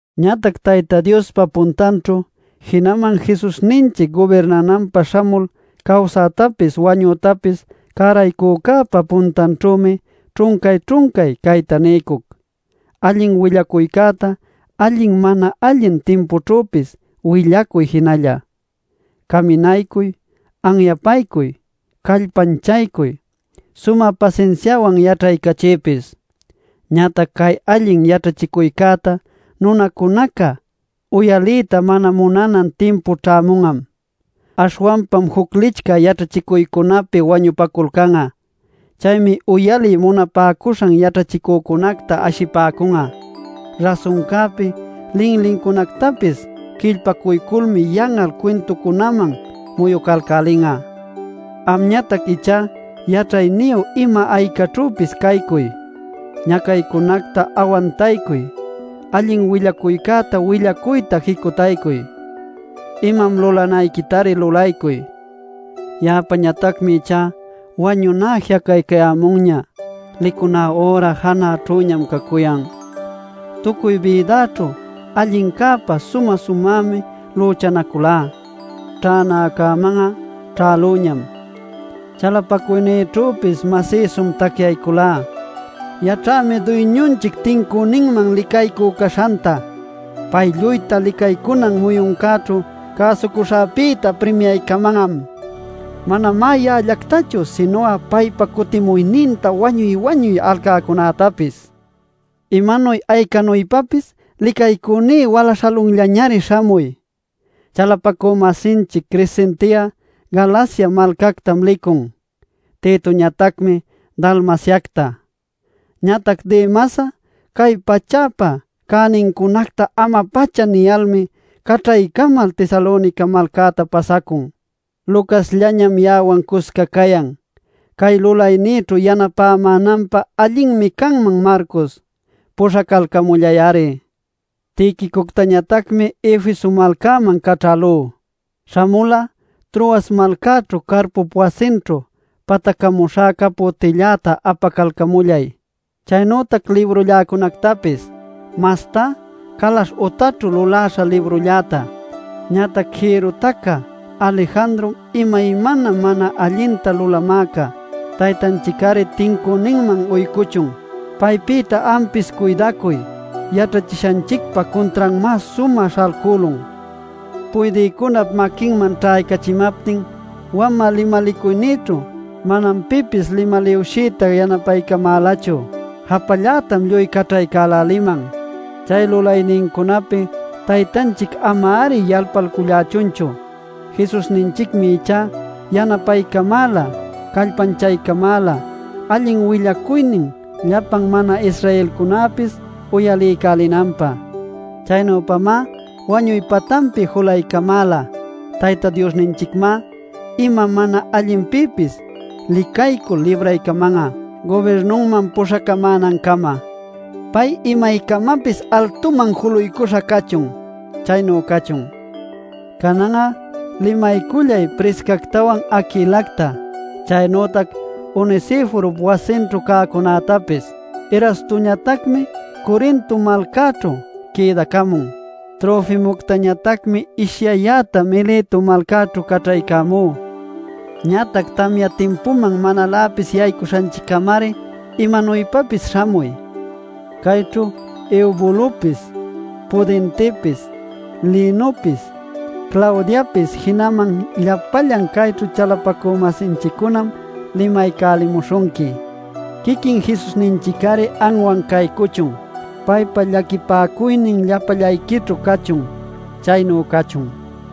Ñatac Tayta Diospa puntanćhu, jinaman Jesusninchic gubirnananpä śhamul cawsätapis wañütapis cäraycücäpa puntanćhümi ćhuncay-ćhuncay cayta niycuc: Allin willacuycäta allin mana allin timpućhüpis willacuy jinalla. Caminaycuy, anyapaycuy, callpanchaycuy, sumä pasinsiawan yaćhaycachiypis. Ñatac cay allin yaćhachicuycäta nunacunaca uyaliyta mana munanan timpu ćhämun'am. Aśhwanpam juc licchä yaćhachicuycunapi wañupaculcan'a. Chaymi uyaliy munapäcuśhan yaćhachicücunacta ashipäcun'a. Rasuncäpi linlincunactapis quillpacuyculmi yan'al cuintucunaman muyucalcälin'a. Amñatac ichá yaćhayniyu ima aycaćhüpis caycuy, ñacaycunäta awantaycuy, allin willacuycäta willacuyta jicutaycuy. Imam lulanayquitari lulaycuy. Ya'apäñatacmi ichá wañuná ji'acaycayämunña; licuná üra janäćhüñam cacuyan. Tucuy bïdäćhu allincäpä sumä-sumämi lüchanaculá; ćhänäcäman'a ćhälüñam; chalapacuynïćhüpis masïsum tacyayculá. Yaćhämi Duyñunchic tincüninman licaycü caśhanta; pay lluyta licaycunan muyuncäćhu cäsucuśhäpïta primiaycaman'am. Manamá ya'allactachu sinu'a paypa cutimuyninta wañuy-wañuy alcäcunätapis. Imanuy aycanuypapis licaycüní wala śhalunllañari śhamuy. Chalapacü-masinchic Crescente'a Galacia malcactam licun. Titoñatacmi Dalmaciacta. Ñatac Demas'a cay pachäpa cänincunacta ama-pacha niyalmi caćhaycamal Tesalonica malcäta pasacun. Lucasllañam ya'awan cusca cayan. Cay lulaynïćhu yanapämänanpä allinmi canman Marcos; puśhacalcamullay-ari. Tiquicoctañatacmi Efeso malcaman caćhälú. Śhamul'a Troas malcaćhu Carpop wasinćhu patacämuśhä caputilläta apacalcamullay, chaynütac librulläcunactapis, mastá calaśh utaćhu luläśha librülläta. Ñatac jïrru tacä Alejandrom imaymana mana allinta lulamäca. Taytanchic-ari tincüninman uycuchun. Paypïta ampis cuydacuy, yaćhachishanchicpa cuntranmá sumä śhalcülun. Puydïcunap maquinman ćhaycachimaptin wamä limalicuynïćhu manam pipis limaliwshiyta yanapaycamälachu. ¡Japallätam lluy caćhaycäläliman! Chay lulaynincunapi Taytanchic ama-ari yalpalcullächunchu. Jesusninchicmi ichá yanapaycamäla callpanchaycamäla allin willacuynin llapan mana-Israelcunäpis uyaliycälinanpä. Chaynüpamá wañuy patanpi julaycamäla. Tayta Diosninchicmá ima mana allinpïpis licaycul libraycaman'a, gubirnunman puśhacamänancama. ¡Pay imaycamapis altuman juluycuśha cachun! Chaynu cachun. Canan'a limaycullay Priscactawan, Aquilacta, chaynütac Onesiforop wasinćhu cäcunätapis. Erastoñatacmi Corinto malcaćhu quïdacamun. Trofimoctañatacmi ishyayäta Mileto malcaćhu caćhaycamú. Ñatac tamya timpuman manaläpis yaycuśhanchiccämari imanuypapis śhamuy. Cayćhu Eubulopis, Pudentepis, Linopis, Claudiapis jinaman llapallan cayćhu chalapacü-masinchiccunam limaycälimuśhunqui. Quiquin Jesusninchic-ari anwan caycuchun. Paypa llaquipäcuynin llapallayquićhu cachun. Chaynu cachun.